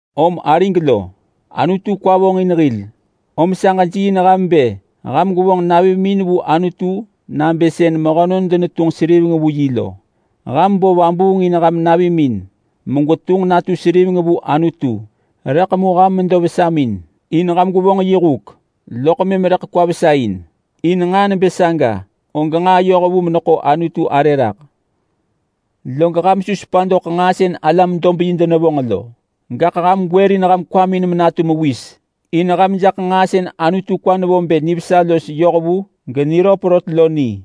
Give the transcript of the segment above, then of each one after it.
Om arig lo, Anutu kwa vonġin hil, om sa ġejiiin ham bë ham gwevonġ navimin vu Anutu nabë sën mehönon denetunġ seriveng vu yi lo. Ham bo vabuung in ham navimin megwetunġ natu seriveng vu Anutu, rëḳ mu ham medo vesamin in ham gwevonġ yi huk, loḳ mëm rëḳ kwa vesa in. In nġaa nebë saga og nġaa yohvu meneḳo Anutu arë raḳ. Log ham su sepa doḳ nġaa sën alam-dob-yi denevonġ lo, gaḳ ham gwërin ham kwamin menatu mewis in ham jaḳ nġaa sën Anutu kwa nevo bë nivesa los yohvu geniröp rot lo ni.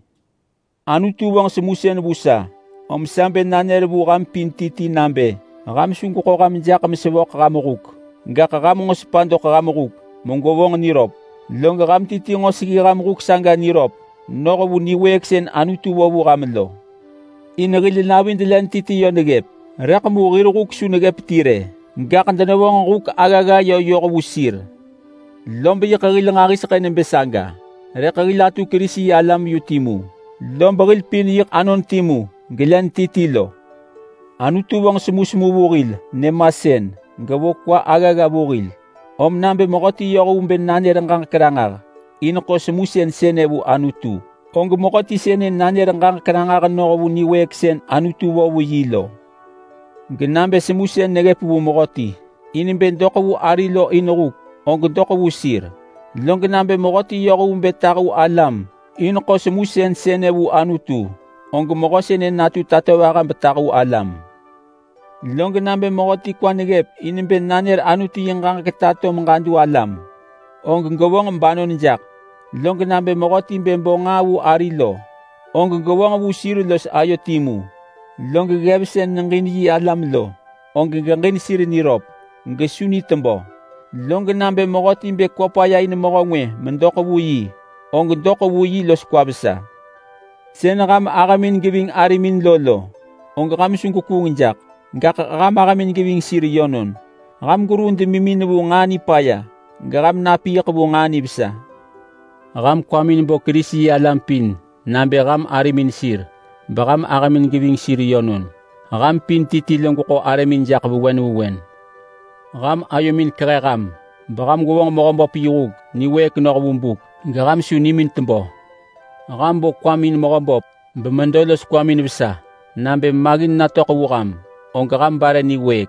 Anutu vonġ semusën vu sa, om sa bë nanër vu ham pin ti ti nabë ham su gweḳo ham jaḳ mesevöḳ ham huk, gaḳ ham nġo sepa doḳ ham huk megwevonġ niröp. Log ham ti ti nġo seggi ham huk saga niröp noh vu niwëëk sën Anutu vo vu ham lo. In hil navid len ti ti lo neggëp, rëḳ mu hir huk su neggëp ti rë, gaḳ denevonġ huk aggagga yö yoh vu sir. Lob yiḳ hil nġahiseḳë nebë saga, rëḳ hil atu Kerisi-yi-alam yu timu. Lob hil pin yiḳ anon timu gelen ti ti lo. Anutu vonġ semusemu vu hil nyëmasën, gevo kwa aggagga vu hil, om nabë mehöti yoh vu bë nanër ġaġek ranġah in ḳo semusën sënë vu Anutu, og mehöti sënë nanër ġaġek ranġah noh vu niwëëk sën Anutu vo vu yi lo. Genabë semusën neggëp vu mehöti in bë geġin ari lo in huk og geġin. Log nabë mehöti yoh vu bë tahu alam in ḳo semusën sënë vu Anutu, og mehö sënë natu tatovaha betahu alam. Log nabë mehöti kwa neggëp in bë nanër Anutu yi ġaġek tato vu alam, og gevonġ banon jaḳ. Log nabë mehöti bë bo nġaa vu ari lo, og gevonġ vu sir los ayo timu. Log ggev sën neġin yi alam lo, og geġin sir niröp gesu ni tebö. Log mehöti bë kwa paya in ari medoḳ vu yi, og doḳ vu yi los kwa vesa. Sën ham ahëmin geving arimin lo lo, og ham su gwekuung jaḳ. Gaḳ ham ahëmin geving sir yönon. Ham gweruu demimin vu nġaa nipaya geham napiiḳ vu nġaa nivesa. Ham kwamin bo Kerisi-yi-alam pin nabë ham arimin sir bemëm ham ahëmin geving sir yönon. Ham pin ti ti gweḳo arëmin jaḳ vewen vewen. Ham ayomin kehe ham beham gwevonġ Mehöböp yi huk niwëëk noh vu buk geham su nimin tebö. Ham bo kwamin in Mehöböp bemedo los kwamin vesa. Nabë maggin natöḳ vu ham, og ham bare niwëëk.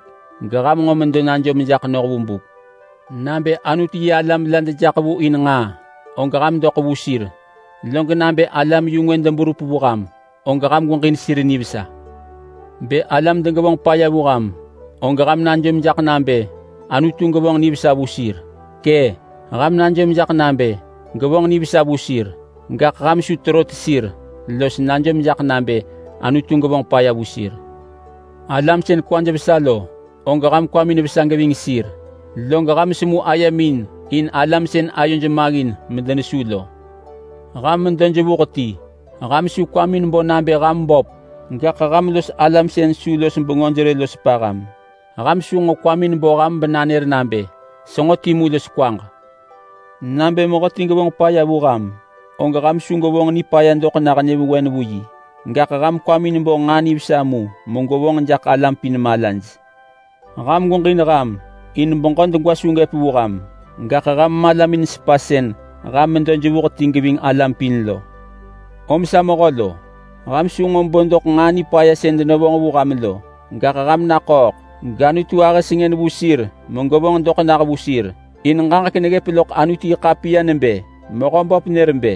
Geham nġo medo najom jaḳ noh vu buk. Nabë Anutu-yi-alam la dejaḳ vu in nġaa, og ham doḳ vu sir, log nabë alam-yu-ngwë deberup vu ham, og ham gweġin sir nivesa. Bë alam degevonġ paya vu ham, og ham najom jaḳ nabë Anutu gevonġ nivesa vu sir. Kë! Ham najom jaḳ nabë gevonġ nivesa vu sir. Gaḳ ham su terot sir los najom jaḳ nabë Anutu gevonġ paya vu sir. Alam sën kwaj vesa lo, og ham kwamin vesa geving sir, log ham semu ayemin in alam sën ayoj maggin medenesu lo. Ham medo jevuh ti. Ham su kwamin bo nabë ham böp, gaḳ ham los alam sën su los bengöj rë lo sepa ham. Ham su nġo kwamin bo ham menanër nabë, “Senġo timu los kwaġ!” Nabë mehöti gevonġ paya vu ham, og ham su gwevonġ nipaya doḳ nah nyëvewen vu yi. Gaḳ ham kwamin bo nġaa nivesa mu megwevonġ jaḳ alam pin malaj. Ham gweġin ham in beġö degwa su gëp vu ham, gaḳ ham malamin sepa sën ham medo jevuh ti geving alam pin lo. Om sa mehö lo, ham su nġo bo doḳ nġaa nipaya sën denevonġ vu ham lo, gaḳ ham naḳööḳ gAnutu ahë sengën vu sir megevonġ doḳ nah vu sir. In ġaġek neggëp loḳ Anutu-yi-ḳapiya nebë: Mehöböp nër bë,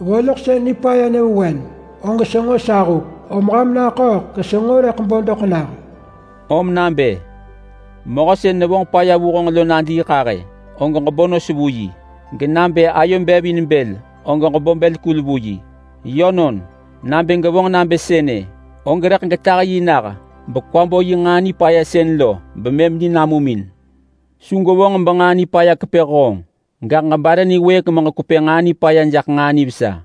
“Voloḳsën nipaya nyëvewen og senġo sa huk, om ham naḳööḳ gesenġo rëḳ bo doḳ nah.” Rëḳ mu nabë: “Mehö sën nevonġ paya vu honġ lo nadiiḳahë, og ġebo nos vu yi. Genabë ayo bev in bël og ġebo bël kul vu yi. Yönon, nabë gwevonġ nabë sënë, og rëḳ getah yi nah bekwa bo yi nġaa nipaya sën lo bemëm ni namum in.” Su gwevonġ benġaa nipaya kepë honġ, gaḳ ġebare niwëëk meġekwepë nġaa nipaya jaḳ nġaa nivesa.